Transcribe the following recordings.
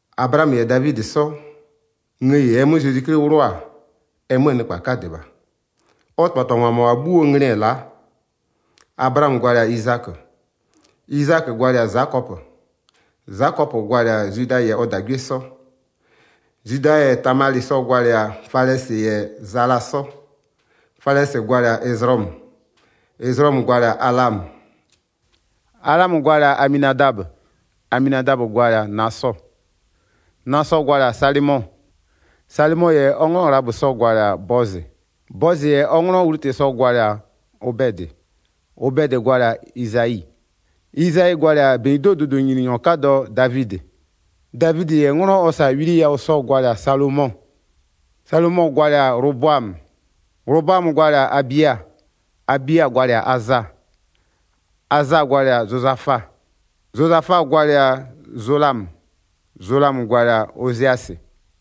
Ablaamö -yɛ Davidɩ 'sɔ, ngëyi -ɛɛ 'mö Zezwi 'Kli 'wlʋ-a, ɛ 'möö nɩkpa 'kadɩ -bha. Ɔ -tɩbhatɩbhangwa -mʋabha 'bhuoo nglɩ-ɛ la'a: Ablaamö gwalɩ-a Izakö, Izakö gwalɩ-a Zakɔpö, Zakɔpö gwalɩ-a Zwida -yɛ ɔ -dagwie 'sɔ. Zwida -yɛ Tamalɩ sɔ-ɔ gwalɩ-a Falɛsɩ -yɛ Zala 'sɔ. Falɛsɩ gwalɩ-a Ɛzlɔmö, Ɛzlɔmö gwalɩ-a Alamö. Alamö gwalɩ-a Aminadabö, Aminadabö gwalɩ-a Nasɔ, Nasɔ gwalɩ-a Salɩmɔ. Salɩmɔ -yɛ ɔ 'nglɔ Ghlabö sɔ-ɔ gwalɩ-a Bɔzɩ, Bɔzɩ -yɛ ɔ 'nglɔ Wlutɩ sɔ-ɔ gwalɩ-a Obɛdɩ, Obɛdɩ gwalɩ-a Izayi, Izayi gwalɩ-a -benyido'oo dʋdʋnyininyɔ 'kadɔ Davidɩ. Davidɩ -yɛ 'nglɔ ɔ -sa-a Wili yawʋ sɔ-ɔ gwalɩ-a Salomɔ. Salomɔ gwalɩ-a Ghlobʋamö, Ghlobʋamö gwalɩ-a Abia, Abia gwalɩ-a Aza. Aza gwalɩ-a Zozafa, Zozafa gwalɩ-a Zolamö, Zolamö gwalɩ-a Oziasɩ.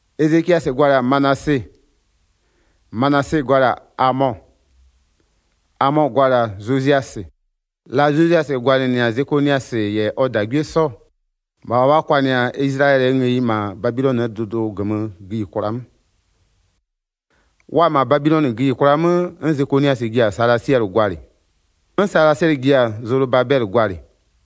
Ezekiasɩ gwalɩ-a Manase, Manase gwalɩ-a Amɔ, Amɔ gwalɩ-a Zoziasɩ. La Zoziasɩ gwalɩnɩ-a Zekoniasɩ -yɛ ɔ -dagwie 'sɔ-ɔ, -bha wa kwanɩ-a Izlayɛlɩɛ ngëyi -ma Babilɔnɩɛ dʋdʋ -gömö gïyikwla 'mö. Wa-a -ma Babilɔnɩ gïyikwla 'mö 'n Zekoniasɩ ji-a Salasiɛlɩ gwalɩ. 'N Salasiɛlɩ ji-a Zolobabɛlɩ gwalɩ.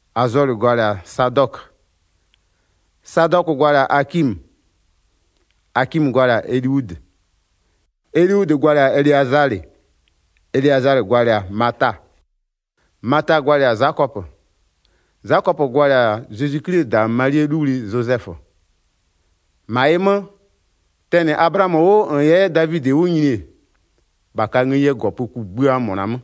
Azɔlɩ gwalɩ-a Sadɔkö, Sadɔkö gwalɩ-a Akimö, Akimö gwalɩ-a Eliudɩ. Eliudɩ gwalɩ-a Eleazalɩ, Eleazalɩ gwalɩ-a Mata, Mata gwalɩ-a Zakɔpö. Zakɔpö gwalɩ-a Zezwi 'Klie -da Malie 'luwli Zozɛfö. 17-Ma ɩ 'mö, tɛnɩ Ablaamö 'wʋ -n 'yɛ Davidɩ 'wʋ nyini-e, -bha ka ngëyie -gɔpö kugbïa -mʋna 'mö.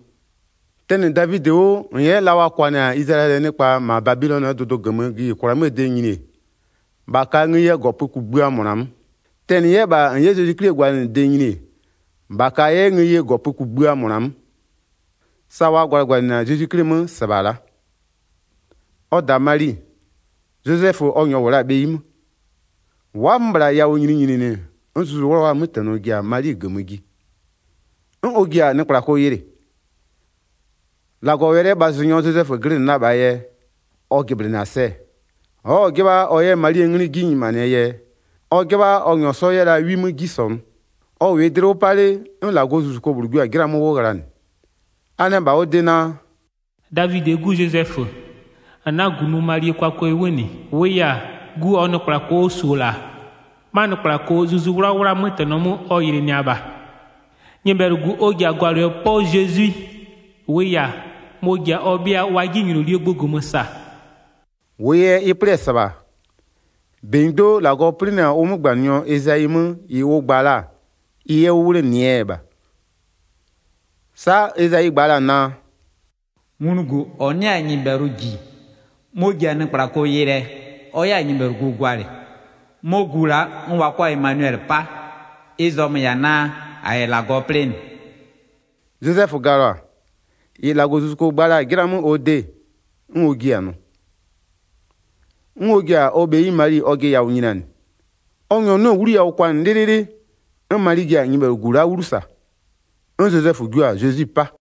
Tɛnɩ Davidɩ 'wʋ -n 'yɛ la wa kwanɩ-a Izlayɛlɩɛ nɩkpa -ma Babilɔnɩɛ dʋdʋ -gömö gïyikwla 'möö de nyini-e, -bha ka ngëyie -gɔpö kugbïa -mʋna 'mö. Tɛnɩ 'yɛ -bha, -n 'yɛ Zezwi 'Klie gwalɩnɩde nyini-e, -bha ka 'yɛ ngëyie -gɔpö kugbïa -mʋna 'mö. Sa wa gwalɩgwalɩnɩ-a Zezwi 'Kli 'mö -sɩbha la'a. Ɔ -da Mali, Zozɛfö ɔ -nyɔɔ -wʋ la-a bheyi 'mö, wa'a-a 'mö -bhla yawʋ nyininyininɩ 'n Zuzu 'Wlawlaa 'mötɛnɔ ji-a Mali -gömö ji, 'n ɔ ji-a nɩkplako yɩlɩ. 19-Lagɔwɛlɩɛ -bhazʋnyɔ Zozɛfö glɩnɩ la -bhaa yɛ ɔ jɩblɩnɩ-a sɛ, ɔ'ɔ-ɔ 'jɩbha ɔ 'yɛ Malie 'nglɩ 'ji nyimanɩɛ yɛ, ɔ 'jɩbha ɔ -nyɔɔ 'sɔ 'yɛ la 'wi 'mö 'ji -sɔnʋ. Ɔ -wɩɩ dlɩ 'wʋ 'pa 'le, 'n -Lagɔzuzuko -bhlʋ jio-a 'jɩla 'mö 'wʋ ghlanɩ, a nɛ -bha ɔ de naa: “Davidɩɛ 'gu Zozɛfö, -n 'na-a -gunʋ Malie kwakwɛ 'wʋ -nɩ. -Wʋʋ yɛ-a, gu -ɔɔ nɩkplako ɔ -su-o -la, 'ma nɩkplako Zuzu 'Wlawlaa 'mötɛnɔ 'mö ɔ yɩlɩnɩa -bha. Nyɩbhɛlʋgu ɔ ji-a gwalɩɛ 'pɔ Zezwi. -Wʋʋ yɛ-a, mɔ-ɔ ji-a ɔ 'bhɩa wa 'jinylolie gbʋ -gömö -saa.” 22-Wʋʋ yɛ ɩ 'plɩ-ɛ -sɩbha, -benyido'o -Lagɔ 'plɩnɩ-a ʋ 'mögbanɩnyɔ Ezayi 'mö -ɩ ʋ gba la-a ɩ 'yɛ 'wʋ 'wlenɩɛ yɛ -bha. Sa'a Ezayi gba la-a naa: “Nglugu -ɔ 'nɩ-a nyɩbhɛlʋ -ji mɔ-ɔ ji-a nɩkplako yɩlɩɛ ɔ 'yɛ-a nyɩbhɛlʋgu gwalɩ, 'mɔ gu la'a 'n wa 'kɔ-a Emanuwɛlɩ 'pa. Ɩ zɔmö-ö -yɛ-a naa: -A -yɛ -Lagɔ plɩnɩ.” Zozɛfö galɔ-a, -ɩ -Lagɔzuzuko gba la-a 'jɩla 'mö ɔ de, 'n ɔ jiɩ-a nʋ. 'N ɔ ji-a ɔ bheyi Mali ɔjɩ yawʋ nyinianɩ. Ɔ -nyɔɔ 'nɩ-ɛ 'wlu yawʋ kwanɩ 'lɩlɩlɩ, 'n Mali ji-a nyɩbhɛlʋgu la'a 'wlu -sa. 'N Zozɛfö jio-a Zezwi 'pa.